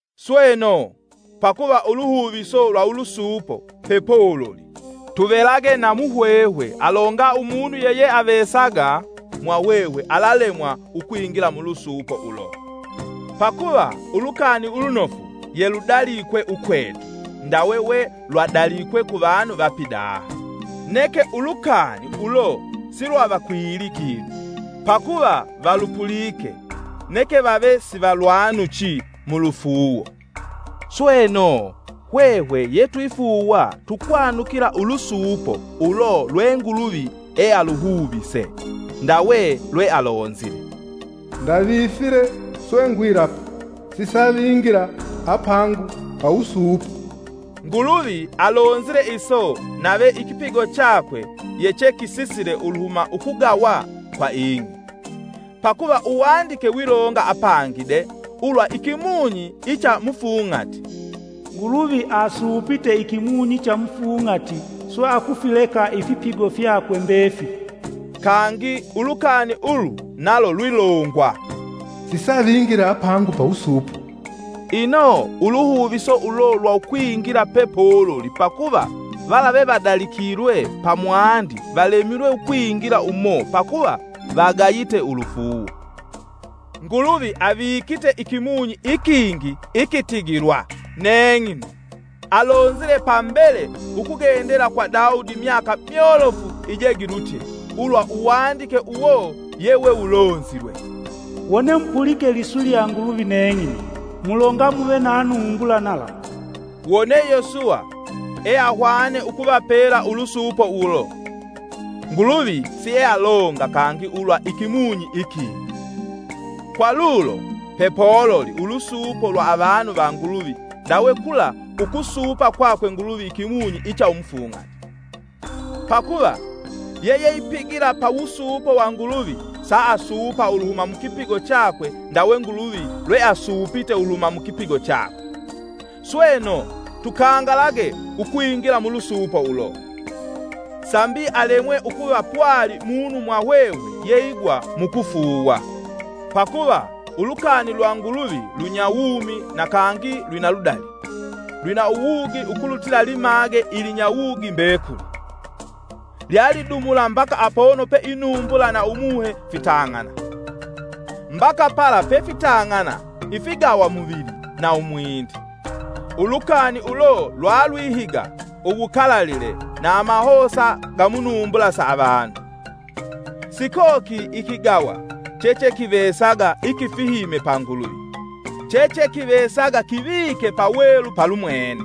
Sweno, pakuva uluhuviso lwa ulusuupo pepololi tuvelage na muhwehwe alonga umunu yeyeavesaga mwahwehwe alalemwa ukwingila mulusuupo ulo. Pakuva Ulukani Ulunofu yeludalikwe ukwetu ndawe welwadalikwe kuvanu va pidaha. Neke ulukani ulo silwavakwili kinu, pakuva valupulike neke vave sivalwanuchi mu lufuuwo. Sweno, hwehwe yetwifuuwa tukwanukila ulusuupo ulo lwe Nguluvi ealuhuvise. Ndawe lwealonzile: “Ndavifile, swe ngwilapa: ‘Sisavingila apangu pawusuupo.’” Nguluvi alonzile iso nave ikipigo chakwe yechekisisile uluhuma ukugawa kwa ing'i. Pakuva Uwandike wilonga apangi de ulwa ikimunyi icha mufung'ati, “Nguluvi asuupite ikimunyi cha mufung'ati swe akufileka ifipigo fyakwe mbefili.” Kangi ulukani ulu nalo lwilongwa, “Sisavingila apangu pawusuupo.” ino uluhuviso ulo lwa ukwingila pepololi pakuva vala vevadalikilwe pamwandi valemilwe ukwingila umo pakuva vagayite ulufuuwo. Nguluvi avikite ikimunyi ikingi ikitigilwa “Neng'ino”. Alonzile pambele ukugendela kwa Daudi myaka myolofu ijegilutye, ulwa uwandike uwo yewewulonzilwe: “Wone mupulike liswi lya Nguluvi neng'ino, mulonga muve na numbula nalamu.” Wone Yosuwa eahwane ukuvapela ulusuupo ulo, Nguluvi siealonga kangi ulwa ikimunyi ikingi. Kwa lulo, pepololi ulusuupo lwa avanu va Nguluvi ndawe kula ukusuupa kwakwe Nguluvi ikimunyi icha umufung'ati. Pakuva, yeyeipigila pawusuupo wa Nguluvi saasuupa uluhuma mukipigo chakwe ndawe Nguluvi lweasuupite uluhuma mu kipigo chakwe. Sweno, tukangalage ukwingila mulusuupo ulo, sambi alemwe ukuva pwali munu mwahwehwe yeigwa mukufuuwa. Pakuva lukani lwa Nguluvi lunyawumi na kangi lwina ludali; lwina uwugi ukulutila limage ilinyawugi mbekuli. Lyalidumula mbaka apono pe inumbula na Umuhe fitang'ana, mbaka pala pefitang'ana ifigawamuvili na umwindi. Ulukani ulo lwalwihiga uwukalalile na amahosa ga munumbula sa avanu. Sikokili ikigawa chechekivesaga ikifihime pa Nguluvi, chechekivesaga kivike pawelu palumwene.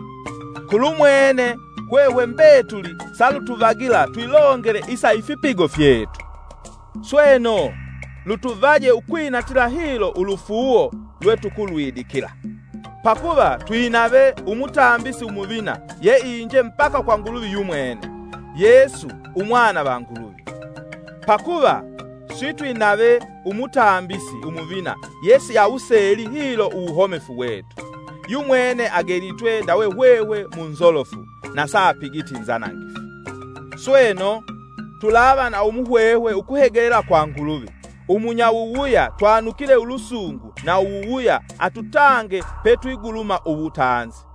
Kulumwene, hwehwe mbetuli salutuvagila twilongele isa ifipigo fyetu. Sweno, lutuvaje ukwinatila hilo ulufuuwo lwetukulwidikila. Pakuva twinave Umutambisi Umuvina yeinje mbaka kwa Nguluvi yumwene—Yesu, Umwana va Nguluvi. Pakuva sitwinave Umuvina yesi awuseele hilo uwuhomefu wetu, yumwene agelitwe ndawe hwehwe munzolofu na saapigiti nzanangifu. Sweno, tulava na umuhwehwe ukuhegelela kwa Nguluvi, umunyawuwuya twanukile ulusungu na uwuwuya atutange petwiguluma uwutanzi.